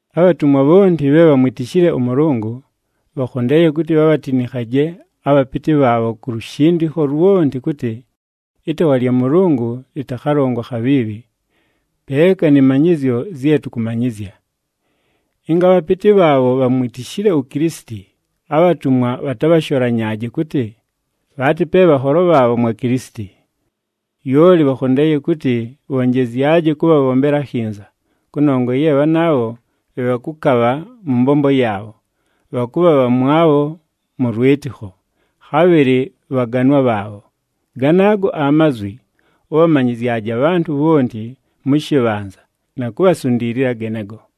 Abhatumwa bhonti bhe bhamwitishile ʉMʉlʉngʉ, bhakhondeeye kʉtɨ bhabhatinikhaje abhapɨtɨ bhaabho ku lushindikho lwonti kʉtɨ, ɨtaawa lya Mʉlʉngʉ lɨtakhalongwe akhabhiibhi, peeka nɨ manyɨzyo zye tʉkʉmanyɨzya. Ɨnga abhapɨtɨ bhaabho bhamwitishile uKilisiti, abhatumwa bhatabhasholanyaaje kʉtɨ, bhaatɨ pe bhanholo bhaabho mwa Kilisiti. Lyoli bhakhondeeye kʉtɨ bhonjezyaje kʉbhabhombela akhinza, kʉnongwa ye bhanaabho bhe bhakʉkabha mʉ mbombo yaabho, bhakʉbha bhamwabho mʉ lwɨtɨkho, khabhɨlɨ bhaganwa bhaabho. Ganaago amazwi, ʉbhamanyɨzyaje abhantʉ bhonti mʉ shɨbhanza, na kubhasundiilila genego.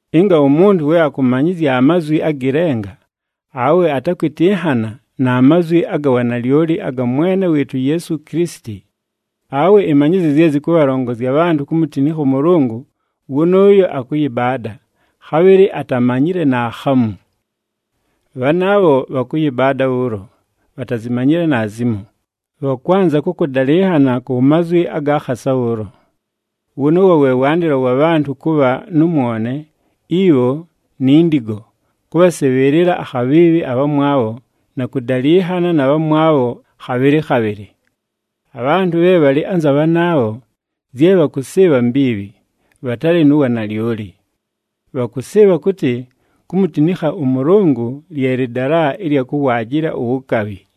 Ɨnga umuntu we akʉmanyɨzya amazwi agɨ lenga, awe atakwɨtɨnhana na mazwi aga wanalyoli aga Mwene wɨɨtʉ uYeesu Kilisiti, awe ɨmanyɨzyo zye zɨkʉbhalongozya abhantʉ kumutinikha ʉMʉlʉngʉ wʉnʉʉyo akʉyɨbaada, khabhɨlɨ atamanyile naakhamu. Bhanaabho bhakʉyɨbaada bhʉʉlo, bhatazimanyile naazimo, bhakwanza kʉ kʉdalɨnhana ku mazwi aga khasa bhʉʉlo. Wʉnʉʉwo we wandɨlo wa bhantʉ kʉbha nʉ mwone, ibho, ni ndigo, kʉbhasɨbhɨɨlɨla akhabhiibhi abhamwabho, na kʉdalɨnhana na bhamwabho khabhɨlɨ khabhɨlɨ. Abhantʉ bhe bhalɨ anza bhanaabho, zye bhakʉsɨɨbha mbiibhi, bhatalɨ nu wanalyoli. Bhakʉsɨɨbha kʉtɨ, kumutinikha ʉMʉlʉngʉ lye lɨdala ɨlya kʉwaajɨla uwukabhi.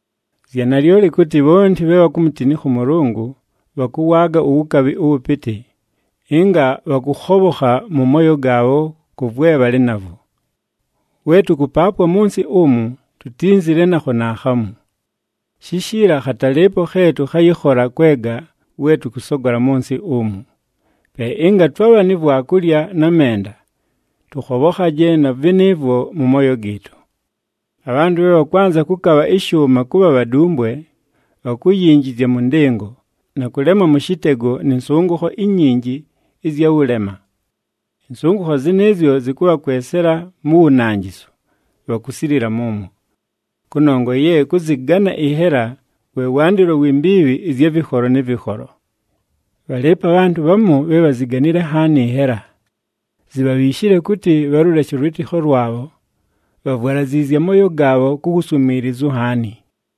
Zya nalyoli kʉtɨ, bhonti bhe bhakumutinikha ʉMʉlʉngʉ bhakʉwaaga uwukabhi ʉwʉpɨtɨ, ɨnga bhakʉkhobhokha mʉ mooyo gaabho kʉ vwe bhalɨ navwo. We tʉkʉpaapwa mʉ nsɨ umu, tutínzile nakho naakhamu. Shishiila, khatalɨɨpo khe tʉkhayɨkhola kwega we tʉkʉsogola mʉ nsɨ umu. Pe ɨnga twabha ni vwakulya na menda, tʉkhobhokhaje na vɨnɨɨvwo mʉ mooyo gɨɨtʉ. Abhantʉ bhe bhakwanza kʉkabha ɨshʉʉma kʉbha bhadumbwe, bhakuyinjizya mʉ ndɨngo, na kʉlemwa mʉ shɨtego nɨ nsʉngʉkho inyinji ɨzya wʉlema. Ɨnsʉngʉkho zɨnɨɨzyo zɨkʉbhakwesela mu wunanjisu, bhakusilila mʉmwo. Kʉnongwa ye kʉzɨgana ɨnhela, we wandɨlo wi mbiibhi ɨzya vɨkholo nɨ vɨkholo. Bhalɨɨpo abhantʉ bhamu bhe bhaziganile nhaani ɨnhela, zibhabhiishile kʉtɨ, bhalʉleshe ʉlwɨtɨkho lwabho, bhavwalaziizye amooyo gaabho ku wuswimiilizu nhaani.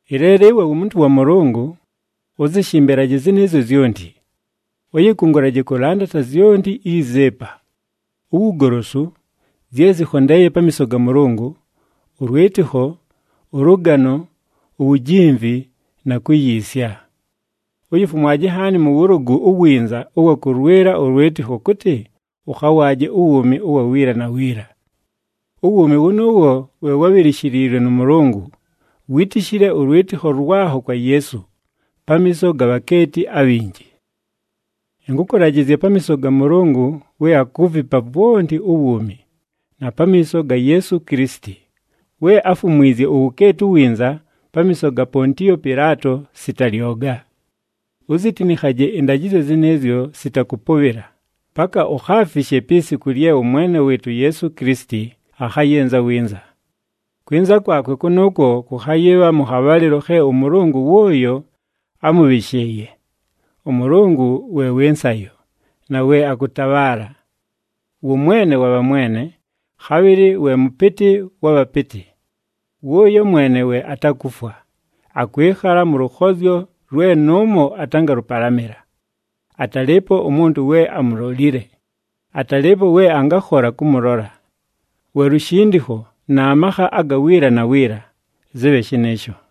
Ɨleelo ɨwe wumuntu wa Mʉlʉngʉ, ʉzɨshɨmbɨle zɨnɨɨzyo zyonti. Ʉyɨkʉngʉlaje kʉlandata zyonti izi ɨpa: uwugolosu, zye zɨkhondeeye pamiiso ga Mʉlʉngʉ, ʉlwɨtɨkho, ʉlʉgano, uwujimvi, na kuyiisya. Uyifumwaje nhaani mʉ wʉlʉgʉ uwinza ʉwa kʉlwɨla ʉlwɨtɨkho kʉtɨ, ʉkhawaaje uwuumi ʉwa wiila na wiila. Uwuumi wʉnʉʉwo we wábhilishiliilwe nʉ Mʉlʉngʉ, wítishile ʉlwɨtɨkho lwakho kwa Yeesu, pamiiso ga bhakeeti abhinji. Ɨnkʉkʉlajɨzya pamiiso ga Mʉlʉngʉ we akuvipa vwonti uwuumi, na pamiiso ga Yeesu Kilisiti, we áfumwizye uwukeeti uwinza pamiiso ga Pontiyo Pɨlaato sita lyoga, uzitinikhaje ɨndajɨzyo zɨnɨɨzyo sita kʉpʉbhɨla, paka ukhaafishe pi siku lye ʉMwene wɨɨtʉ uYeesu Kilisiti akhayɨnza winza. Kwɨnza kwakwe kʉnʉʉkwo kʉkhayɨbha mʉ khabhalɨlo khe ʉMʉlʉngʉ wʉʉyo ámʉbhɨshɨɨye. ɄMʉlʉngʉ we wɨ nsayo, na we akʉtabhaala! Wʉ Mwene wa bhamwene, khabhɨlɨ we Mʉpɨtɨ wa bhapɨtɨ. Wʉʉyo mwene we atakufwa, akwɨkhala mʉ lʉkhozyo lwe nʉʉmo atangalʉpalamɨla. Atalɨɨpo umuntu we amulolile, atalɨɨpo we angakhola kʉmʉlola. Wa lushindikho, na makha aga wiila na wiila! Zɨbhe shɨnɨɨsho!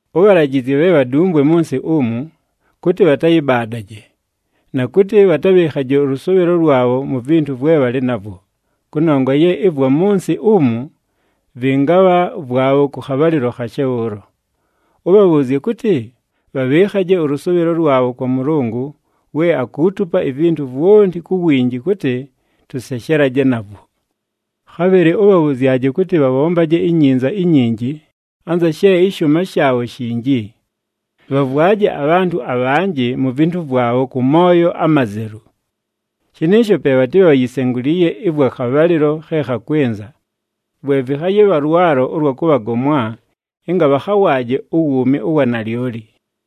Ʉbhalajɨzye bhe bhadumbwe mʉ nsɨ umu kʉtɨ, bhatayɨbaadaje, na kʉtɨ bhatabhɨɨkhaje ʉlʉsʉʉbhɨlo lwabho mu vintu vwe bhalɨ navwo, kʉnongwa ye ɨvwa mʉ nsɨ umu vɨngabha vwabho kʉ khabhalɨlo khashe bhʉʉlo. Ʉbhabhʉʉzye kʉtɨ, bhabhɨɨkhaje ʉlʉsʉʉbhɨlo lwabho kwa Mʉlʉngʉ, we akuutupa ivintu vwonti ku winji kʉtɨ, tʉseshelaje navwo. Khabhɨlɨ ʉbhabhʉzyaje kʉtɨ bhabhombaje inyinza inyinji, anza she ɨshʉʉma shaabho shinji. Bhavwaje abhantʉ abhanjɨ mu vintu vwabho kʉ mooyo amazelu. Shɨnɨɨsho pe bhatɨbhe bhayisenguliiye ɨvwa khabhalɨlo khe khakwɨnza, vwe vɨkhayɨbha lwalo ʉlwa kʉbhagomwa, ɨnga bhakhawaaje uwuumi ʉwa nalyoli.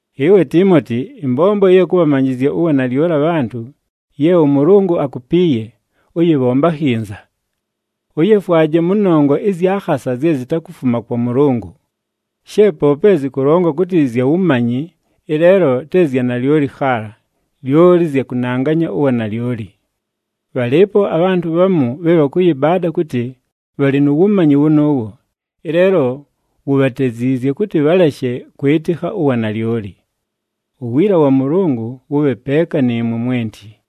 Ɨwe Tiimoti, ɨmbombo ɨya kʉbhamanyɨzya uwanalyoli abhantʉ, ye ʉMʉlʉngʉ akupiiye, ʉyɨbhombe akhinza. Ʉyefwaje mʉ nongwa ɨzya khasa zye zitakufuma kwa Mʉlʉngʉ. She poope zɨkʉlongwa kʉtɨ zya wumanyi, ɨleelo te zya nalyoli khaala, lyoli zya kʉnanganya uwanalyoli. Bhalɨɨpo abhantʉ bhamu bhe bhakʉyɨbaada kʉtɨ, bhalɨ nu wumanyi wʉnʉʉwo, ɨleelo wubhateziizye kʉtɨ bhaleshe kwɨtɨkha uwanalyoli. Uwiila wa Mʉlʉngʉ wʉbhe peeka nɨɨmwe mwenti.